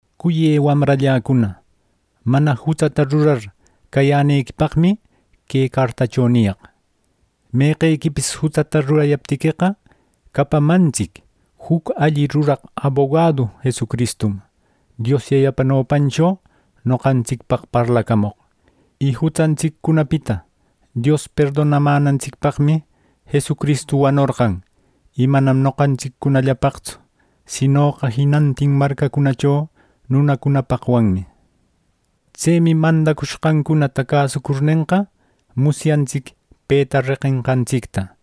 Cuyë wamralläcuna, mana jutsata rurar cayänequipaqmi que cartacho niyaq. Meqequipis jutsata rurayaptiqueqa, capamantsic juc alli ruraq abogadu Jesucristum Dios Yayapa nopancho noqantsicpaq parlacamoq. Y jutsantsiccunapita Dios perdonamänantsicpaqmi, Jesucristu wanorqan. Y manam noqantsiccunallapaqtsu, sinoqa jinantin marcacunacho nunacunapaqwanmi. Tsemi mandacushqancunata cäsucurnenqa, musyantsic peta reqenqantsicta.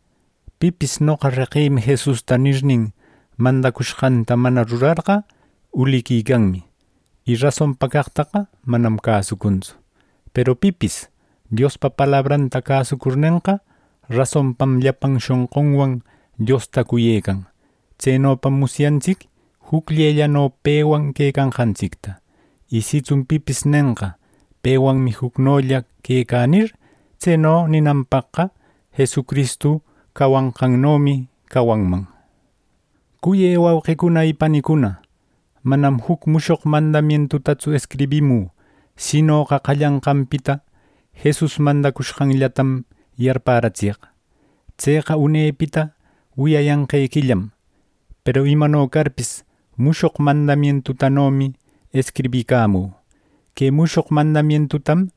Pipis “Noqa reqïmi Jesusta” nirnin, mandacushqanta mana rurarqa, uliquicanmi; y rasonpa caqtaqa manam cäsucuntsu. Peru pipis Diospa palabranta cäsucurnenqa, rasonpam llapan shonqunwan Diosta cuyecan. Tsenopam musyantsic jucllellano pewan quecanqantsicta. Y sitsun pipis nenqa “Pewanmi jucnolla quecä” nir; tseno ninanpaqqa Jesucristu cawanqannomi cawanman. Cuyë wauqicuna y panicuna, manam juc mushoq mandaquitatsu escribimü, sinoqa qallananpita Jesus mandacushqanllatam yarpäratsiyaq. Tseqa unepita wiyayanqequillam. Peru imano carpis, mushoq mandamientutanomi escribicamü. Que mushoq mandamientutam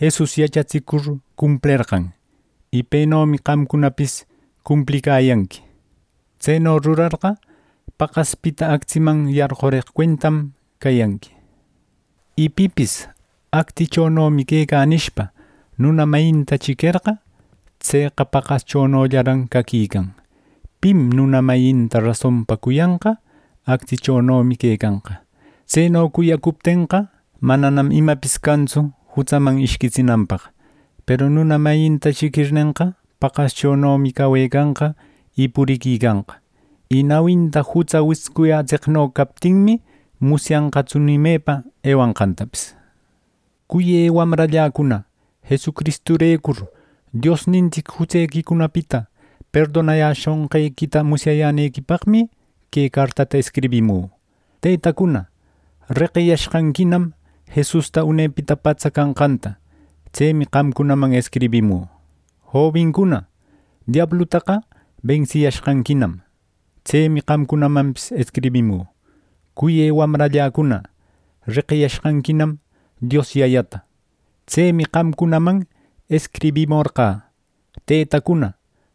Jesus yachatsicur cumplerqan. Y penomi qamcunapis cumplicayanqui. Tseno rurarqa, paqaspita actsiman yarqureq cuentam cayanqui. Y pipis “Actsichonomi quecä” nishpa, nuna mayinta chiquerqa, tseqa paqaschonollaran caquican. Pim nuna mayinta rasonpa cuyanqa; actsichonomi quecanqa. Tseno cuyacuptenqa, mananam imapis cantsu jutsaman ishquitsinanpaq. Peru nuna mayinta chiquirnenqa, paqaschonomi cawecanqa y puriquicanqa. Y nawinta jutsa wiscuyätseqno captinmi, musyanqatsu ni mepa ewanqantapis. Cuyë wamralläcuna, Jesucristurecur Diosnintsic jutsequicunapita perdonayäshonqequita musyayänequipaqmi, que cartata escribimü. Tëtacuna, reqiyashqanquinam Jesusta unepita patsa canqanta; tsemi qamcunaman escribimü. Jobincuna, diablutaqa bensiyashqanquinam. Tsemi qamcunamanpis escribimü. Cuyë wamralläcuna, reqiyashqanquinam Dios Yayata. Tsemi qamcunaman escribimorqä. Tëtacuna,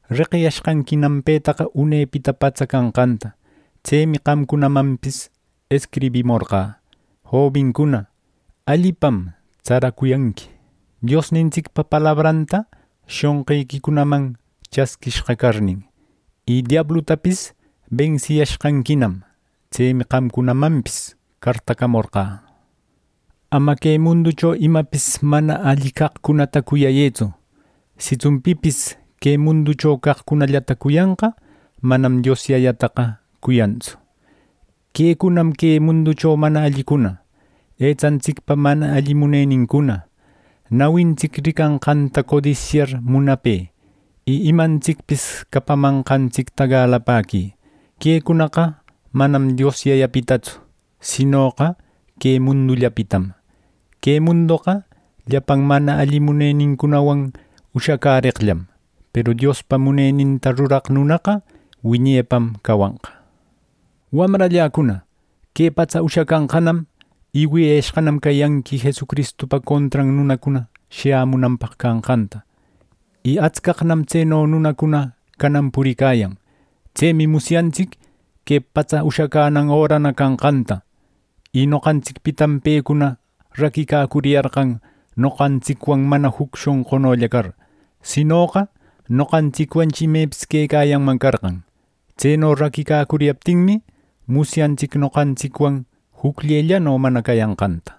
reqiyashqanquinam petaqa unepita patsa canqanta; tsemi qamcunamanpis escribimorqä. Jobincuna, allipam tsaracuyanqui, Diosnintsicpa palabranta shonqiquicunaman chasquishqa carnin. Y diablutapis bensiyashqanquinam. Tsemi qamcunamanpis cartacamorqä. Ama que munducho imapis mana alli caqcunata cuyayëtsu. Sitsun pipis que munducho caqcunallata cuyanqa, manam Dios Yayataqa cuyantsu. Quecunam que munducho mana allicuna: etsantsicpa mana alli munenincuna, nawintsic ricanqanta codisyar munape, y imantsicpis capamanqantsicta galapäqui. Quecunaqa manam Dios Yayapitatsu, sinoqa que mundullapitam. Que mundoqa llapan mana alli munenincunawan ushacäreqllam; peru Diospa muneninta ruraq nunaqa wiñepam cawanqa. Wamralläcuna, que patsa ushacanqanam, y wiyayashqanam cayanqui Jesucristupa contran nunacuna shayämunanpaq canqanta. Y atscaqnam tseno nunacuna canan puricayan. Tsemi musyantsic que patsa ushacänan örana canqanta. Noqantsicpitam pecuna raquicacuriyarqan, noqantsicwan mana juc shonqulla car. Sinoqa noqantsicwanchi imepis quecayanman carqan. Tseno raquicacuriyaptinmi, musyantsic noqantsicwan jucllellano mana cayanqanta.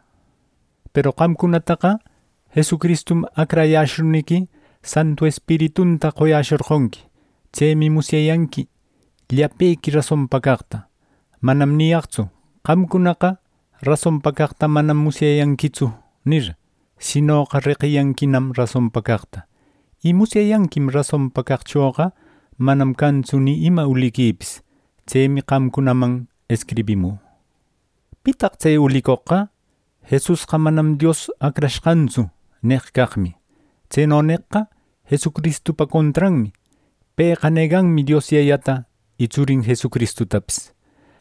Peru qamcunataqa Jesucristum acrayäshurniqui, Santu Espiritunta qoyäshorqonqui. Tsemi musyayanqui llapequi rasonpa caqta. Manam niyaqtsu “Qamcunaqa rasonpa caqta manam musyayanquitsu” nir; sinoqa “Reqiyanquinam rasonpa caqta.” Y musyayanquim rasonpa caqchoqa manam cantsu ni ima uliquipis. Tsemi qamcunaman escribimü. ¿Pitaq tse ulicoqqa: “Jesusqa manam Dios Acrashqantsu!” neq caqmi. Tseno neqqa Jesucristupa contranmi. Pëqa neganmi Dios Yayata y Tsurin Jesustapis.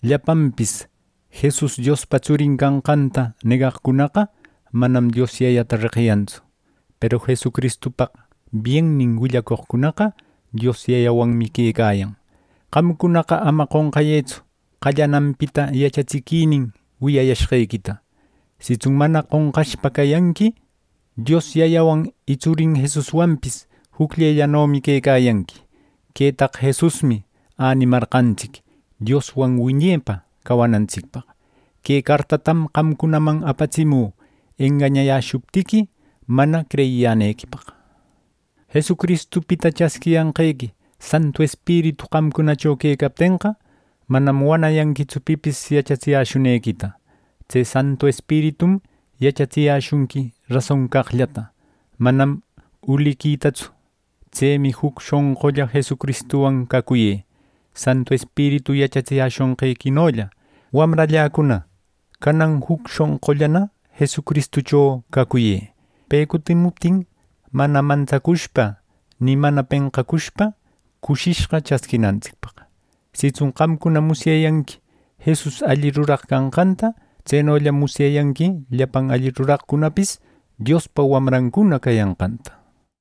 Llapanpis Jesus Diospa Tsurin canqanta negaqcunaqa manam Dios Yayata reqiyantsu; peru Jesucristupaq biennin willacoqcunaqa Dios Yayawanmi quecayan. Qamcunaqa ama qonqayëtsu qallananpita yachatsiquinin wiyayashqequita. Sitsun mana qonqashpa cayanqui, Dios Yayawan y Tsurin Jesuswanpis jucllellanomi quecayanqui. Quetaqa Jesusmi änimarqantsic: Dioswan wiñepa cawanantsicpaq. Que cartatam qamcunaman apatsimü engañayäshuptiqui, mana creyiyänequipaq. Jesucristupita chasquiyanqequi Santu Espiritu qamcunacho quecaptenqa, manam wanayanquitsu pipis yachatsiyäshunequita. Tse Santu Espiritum yachatsiyäshunqui rason caqllata, manam uliquitatsu. Tsemi juc shonqulla Jesucristuwan cacuyë, Santu Espiritu yachatsiyäshonqequinolla. Wamralläcuna, canan juc shonqullana Jesucristucho cacuyë, pe cutimuptin mana mantsacushpa ni mana penqacushpa cushishqa chasquinantsicpaq. Sitsun qamcuna musyayanqui Jesus alli ruraq canqanta; tsenollam musyayanqui llapan alli ruraqcunapis Diospa wamrancuna cayanqanta.